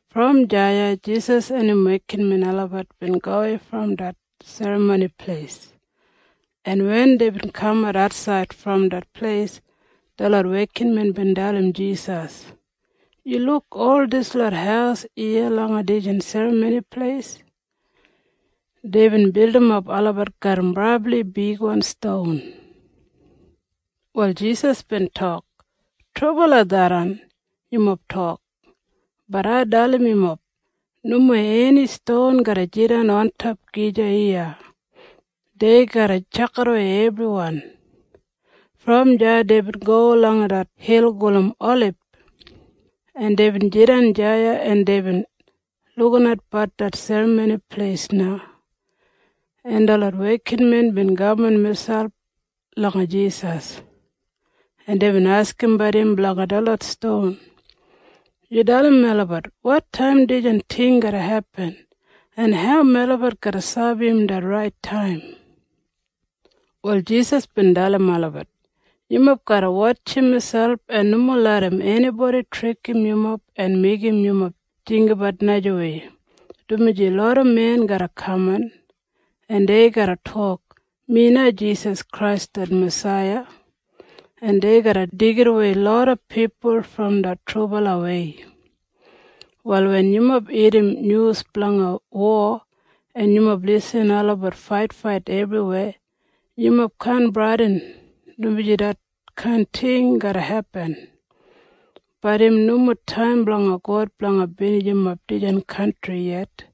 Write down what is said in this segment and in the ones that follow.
Brom deya Jisas en im wekinmen olabat bin gowei brom det Serramoni Pleis, en wen deibin kamat atsaid brom det pleis, detlot wekinmen bin dalim Jisas, “Yu luk ol dislot haus iya langa dijan Serramoni Pleis? Deibin bildimap olabat garram brabli bigwan ston.” Wal Jisas bin tok, “Trubala tharran yumob tok. Bat ai dalim yumob. Nomo eni ston garra jidan ontop gija iya. Dei garra tjakidawei ebriwan.” Brom deya deibin go langa det hil gulum Olib, en deibin jidan deya, en deibin lukinatbat det Serramoni Pleis na, en detlot wekinmen bin kaman miselp langa Jisas, en deibin askimbat im blanga detlot ston, “Yu dalim melabat wotaim dijan ting garra hepin, en hau melabat garra sabi im det rait taim.” Wal Jisas bin dalim olabat, “Yumob garra wotjim miselp en nomo larram enibodi trikim yumob en meigim yumob jinggabat najawei, dumaji loda men garra kaman, en dei garra tok, ‘Mi na Jisas Krais det Masaiya.’ En dei garra deigidawei loda pipul brom det trubalawei. “Wal wen yumob irrim nyus blanga wo, en yumob lisin olabat faitfait ebriweya, yumob kaan bradin, dumaji detkain ting garra hepin. Bat im nomo taim blanga God blanga binijimap dijan kantri yet.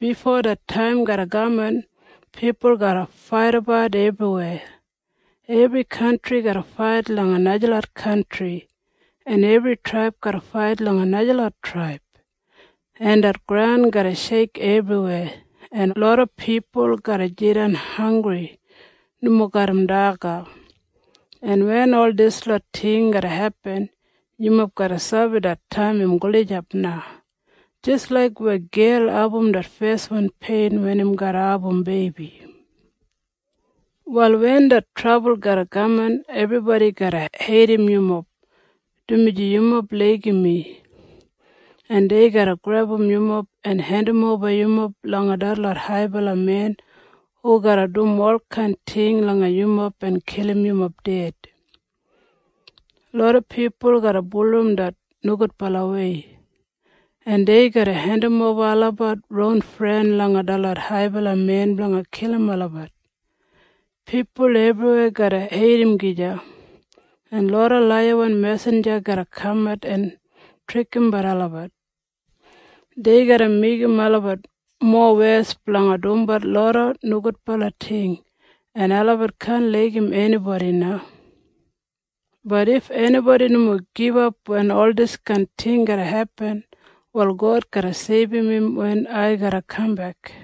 Bifo det taim garra kaman, pipul garra faidabat ebriweya. Ebri kantri garra fait langa najalot kantri, en ebri traib garra fait langa najalot traib, en det graun garra sheik ebriweya, en loda pipul garra jidan hanggri nomo garram daga. En wen ol dislot ting garra hepin, yumob garra sabi det taim im gulijap na jis laik weya gel abum det feswan pein wen im garra abum beibi. “Wal wen det trabul garra kaman, ebribodi garra heidim yumob, dumaji yumob laigim mi, en dei garra grebum yumob en hendimoba yumob langa detlot haibala men hu garra dum olkain ting langa yumob en kilim yumob ded. Loda pipul garra bulurrum det nogudbalawei, en dei garra hendimoba olabat ron fren langa detlot haibala men blanga kilim olabat. Pipul ebriweya garra heidim gija, en loda laiyawan mesinja garra kamat en trikimbat olabat. Dei garra meigim olabat mowes blanga dumbat loda nogudbala ting, en olabat kaan laigim enibodi na. Bat if enibodi nomo gibap wen ol diskain ting garra hepin, wal God garra seibum im wen ai garra kambek.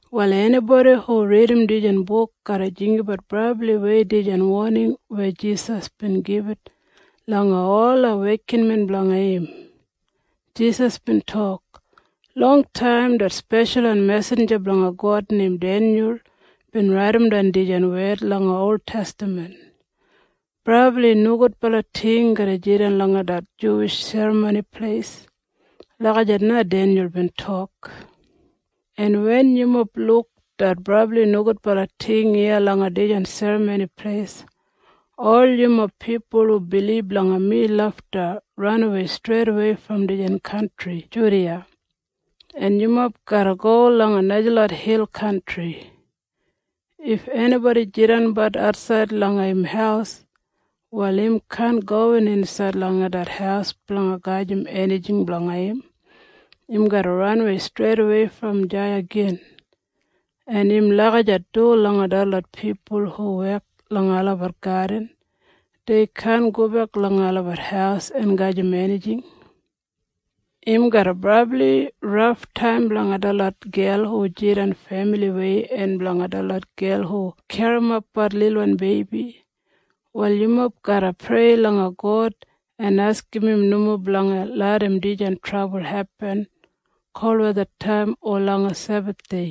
Wal enibodi hu ridim dijan buk garra jinggabat brabliwei dijan woning weya Jisas bin gibit langa ola wekinmen blanga im. Jisas bin tok, “Longtaim det speshalwan mesinja blanga God neim Denyul bin raidimdan dijan wed langa oltestaman, ‘Brabli nogudbala ting garra jidan langa det Juwish Serramoni Pleis.’ Lagijat na Denyul bin tok. En wen yumob luk det brabli nogudbala ting iya langa dijan Serramoni Pleis, ol yumob pipul hu bilib langa mi lafta ranawei streidawei brom dijan kantri Judiya, en yumob garra go langa najalot hil kantri. If enibodi jidanbat atsaid langa im haus, wal im kaan gowin insaid langa det haus blanga gajim enijing blanga im. Im garra ranawei streidawei brom deya gin. En im lagijat du langa detlot pipul hu wek langa olabat gadin. Dei kaan gobek langa olabat haus en gajim enijing. Im garra brabli raftaim blanga detlot gel hu jidan femiliwei en blanga detlot gel hu garrimapbat lilwan beibi. “Wal yumob garra prei langa God en askim im nomo blanga larram dijan trabul hepin kolwethataim o langa Sebathdei,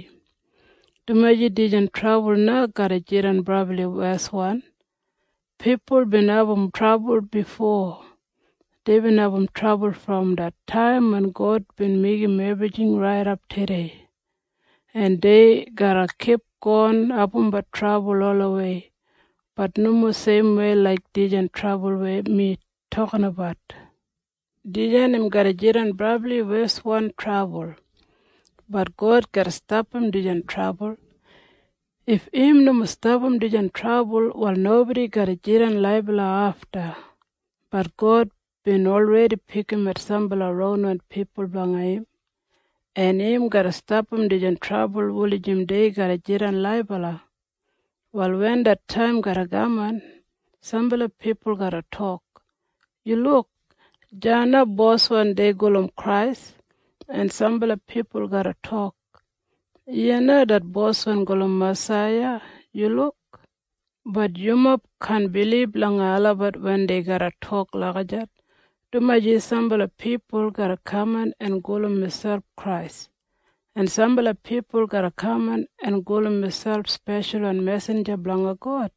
dumaji dijan trabul na garra jidan brabli weswan. Pipul bin abum trabul bifo. Deibin abum trabul brom det taim wen God bin meigim ebrijing raidap tudei, en dei garra kipgon abumbat trabul olawei. Bat nomo seimwei laik dijan trabul weya mi tokinabat. Dijan im garra jidan brabli weswan trabul. Bat God garra stapam dijan trabul. If im nomo stapam dijan trabul, wal nobodi garra jidan laibala afta. Bat God bin olredi pikimat sambala ronwan pipul blanga im, en im garra stapam dijan trabul wulijim dei garra jidan laibala. “Wal wen det taim garra kaman, sambala pipul garra tok, ‘Yu luk! Deya det boswan dei gulum Krais!’ En sambala pipul garra tok, ‘Iya na det Boswan gulum Masaiya! Yu luk!’ Bat yumob kaan bilib langa olabat wen dei garra tok lagijat, dumaji sambala pipul garra kaman en gulum miselp Krais, en sambala pipul garra kaman en gulum miselp speshalwan mesinja blanga God,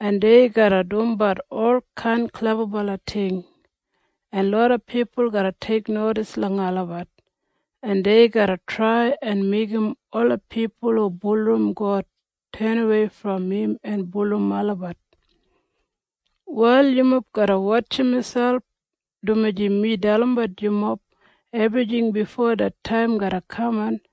en dei garra dumbat olkain klebabala ting, en loda pipul garra teiknodis langa olabat, en dei garra trai en meigim ola pipul hu bulurrum God tenawei brom im en bulurrum olabat. “Wal yumob garra wotjim miselp, dumaji mi dalimbat yumob ebrijing bifo det taim garra kaman.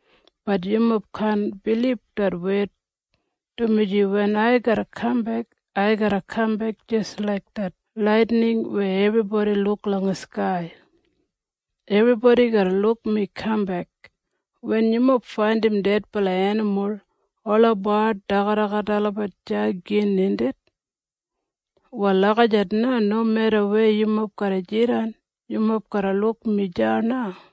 Bat yumob kaan bilib det wed, dumaji wen ai garra kambek, ai garra kambek jis laik det laitining weya ebribodi luk langa skai. Ebribodi garra luk mi kambek. Wen yumob faindim dedbala enimul, ola bard dagat olabat deya gin, indit? Wal lagijat na nomeda weya yumob garra jidan, yumob garra luk mi deya na.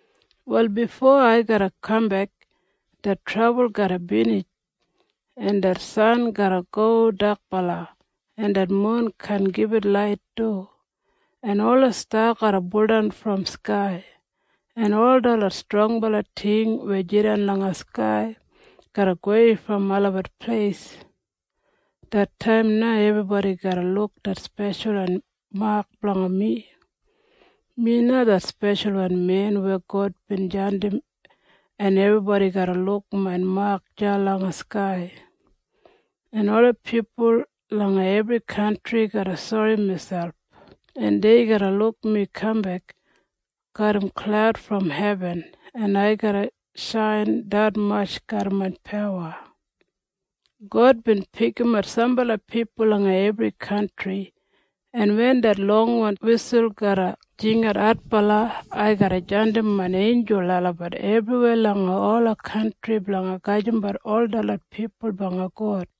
“Wal bifo ai garra kambek, det trabul garra binij, en det san garra go dakbala, en det mun kaan gibit lait du, en ola sta garra buldan brom skai, en ol detlot strongbala ting weya jidan langa skai garra gowei brom olabat pleis. Det taim na ebribodi garra luk det speshalwan mak blanga mi. Mi na det Speshalwan Men weya God bin jandim, en ebribodi garra luk main mak deya langa skai, en ola pipul langa ebri kantri garra sori miselp, en dei garra luk mi kambek garram klaud brom hebin, en ai garra shain detmatj garram main pawa. God bin pikimat sambala pipul langa ebri kantri, en wen det longwan wisul garra jingat adbala, ai garra jandim main einjul olabat ebriweya langa ola kantri blanga gajimbat ol detlot pipul blanga God.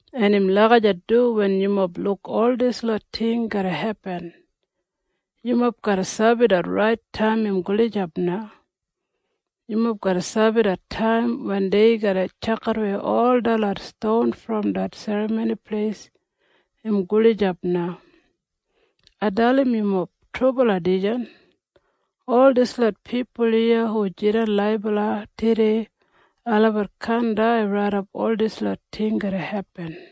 En im lagijat du wen yumob luk ol dislot ting garra hepin. Yumob garra sabi det rait taim im gulijap na. Yumob garra sabi det taim wen dei garra tjakidawei ol detlot ston brom det Serramoni Pleis im gulijap na. Ai dalim yumob trubala dijan. Ol dislot pipul iya hu jidan laibala tudei, olabat kaan dai raidap ol dislot ting garra hepin.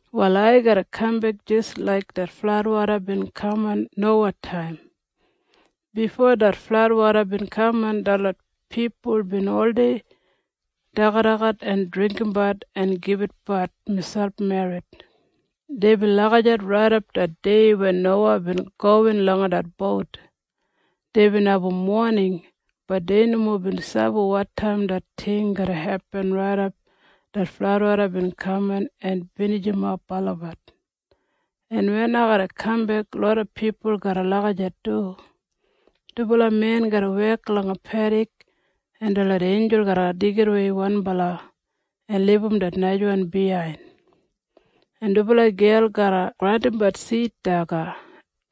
“Wal ai garra kambek jis laik det fladwoda bin kaman Nowataim. Bifo det fladwoda bin kaman, detlot pipul bin oldei dagadagat en dringgimbat en gibitbat miselp merrit. Deibin lagijat raidap det dei wen Nowa bin gowin langa det bout. Deibin abum woning. Bat dei nomo bin sabi wotaim det ting garra hepin raidap det fladwoda bin kaman en binijimap olabat. En wen ai garra kambek, loda pipul garra lagijat du. Dubala men garra wek langa pedik, en detlot einjul garra deigidawei wanbala en libum det najawan biyain. En dubala gel garra grandimbat sid daga,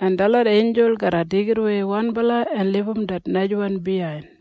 en detlot einjul garra deigidawei wanbala en libum det najawan biyain.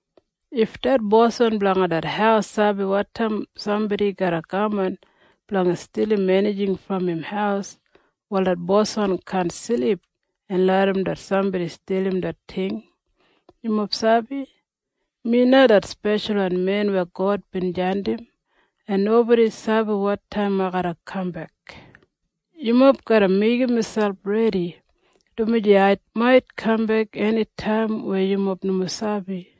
If det boswan blanga det haus sabi wotaim sambodi garra kaman blanga stilim enijing brom im haus, wal det boswan kaan silip en larram det sambodi stilim det ting. Yumob sabi? Mi na det Speshalwan Men weya God bin jandim, en nobodi sabi wotaim ai garra kambek. Yumob garra meigim miselp redi, dumaji ai mait kambek enitaim weya yumob nomo sabi.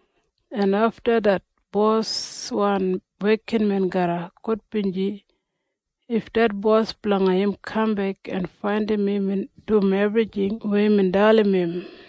en afta det boswan wekinmen garra gudbinji if det bos blanga im kambek en faindim imbin dum ebrijing weya imbin dalim im.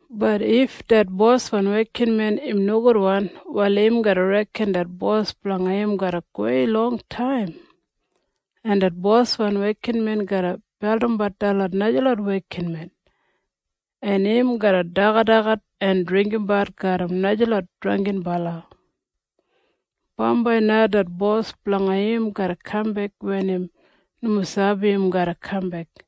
Bat if det boswan wekinmen im nogudwan, wal im garra reken det bos blanga im garra gowei longtaim, en det boswan wekinmen garra beldimbat detlot najalot wekinmen, en im garra dagadagat en dringgimbat garram najalot drangginbala. Bambai na det bos blanga im garra kambek wen im nomo sabi im garra kambek,